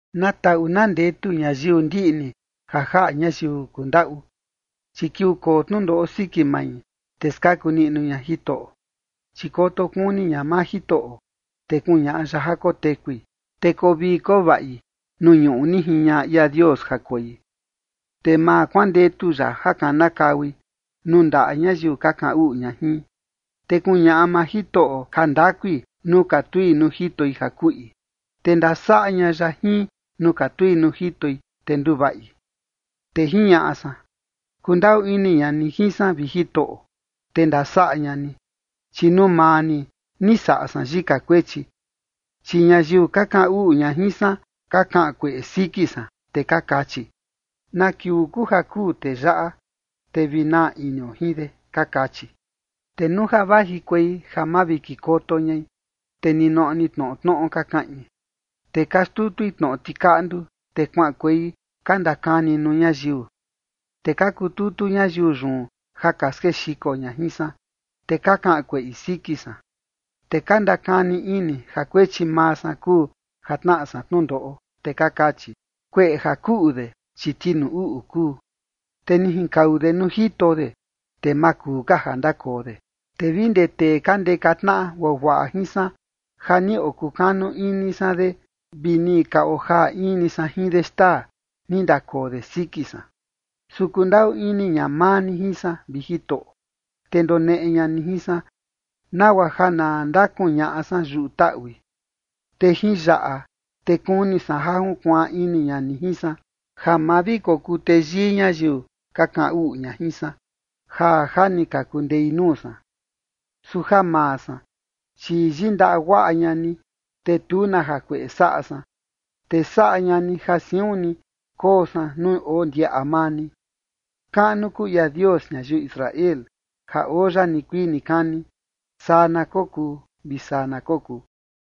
Na taꞌu na ndetu ñayiu ndiꞌni ja jaꞌa ñayiu kundaꞌu, chi kiuu koo tnundoꞌo siki mai, te skaku niꞌnu ña Jitoꞌo. Chi koto kuni ña maa Jitoꞌo, te kuñaꞌa ya ja kotekui. Te koo vii koo vaꞌi nuu ñuꞌu ni jiñaꞌa ia Dios ja koi, te ma kuandetu ya ja kanakaui nuu ndaꞌa ñayiu ka kaꞌan uꞌu ña jin. Te kuñaꞌa maa Jitoꞌo jandakui nuu katui nuu jitoi ja kuꞌi, te ndasaꞌa ña ya jin nuu katui nuu jitoi, te nduvaꞌi. Te jiñaꞌa san: “Kundaꞌu ini ña ni jin san, vi Jitoꞌo, te ndasaꞌa ña ni, chi nuu maa ni, ni saꞌa san yika kuechi”. Chi ñayiu ka kaꞌan uꞌu ña jin san ka kaꞌan kueꞌe siki san, te ka kachi: “¿Na kiuu kuu ja kuu tee yaꞌa, te vi naa inio jin de?”, ka kachi. Te nuu ja vajikuei ja mavikikoto ñai, te ninoꞌo ni tnoꞌo tnoꞌo ka kaꞌin, te ka xtutui tnoꞌo tikaꞌndu, te kuaꞌankuei ka ndakani nuu ñayiu. Te ka kututu ñayiu yun ja ka skexiko ña jin san, te ka kaꞌan kueꞌi siki san, te ka ndakani ini ja kuechi maa san kuu ja tnaꞌa san tnundoꞌo, te ka kachi: “Kueꞌe ja kuꞌu de, chi tinuu uꞌu kuu, te ni jinkau de nuu jito de, te ma kuu ka ja ndakoo de”. Te vi ndee tee ka ndeka tnaꞌa guaguaꞌa jin san ja ni okukanu ini san de, vi ni ka ojaa in ni san jin de xtaa, ni ndakoo de siki san. Su kundaꞌu ini ña maa ni jin san, vi Jitoꞌo, te ndoneꞌe ña ni jin san, nagua ja na ndakuñaꞌa san yuꞌu taꞌui. Te jin yaꞌa, te kuni san ja junkuaan ini ña ni jin san, ja ma vi kokuu teyii ñayiu ka kaꞌan uꞌu ña jin san, ja ja ni ka kundei nuu san. Su ja maa san, chi yindaꞌa guaꞌa ña ni, te tu na jakueꞌe saꞌa san, te saꞌa ña ni ja siun ni koo san nuu oo ndiaꞌa maa ni. Kaꞌnu kuu ia Dios ñayiu Israel, ja oo ya nikuii nikani. Saa na kokuu vi saa na kokuu.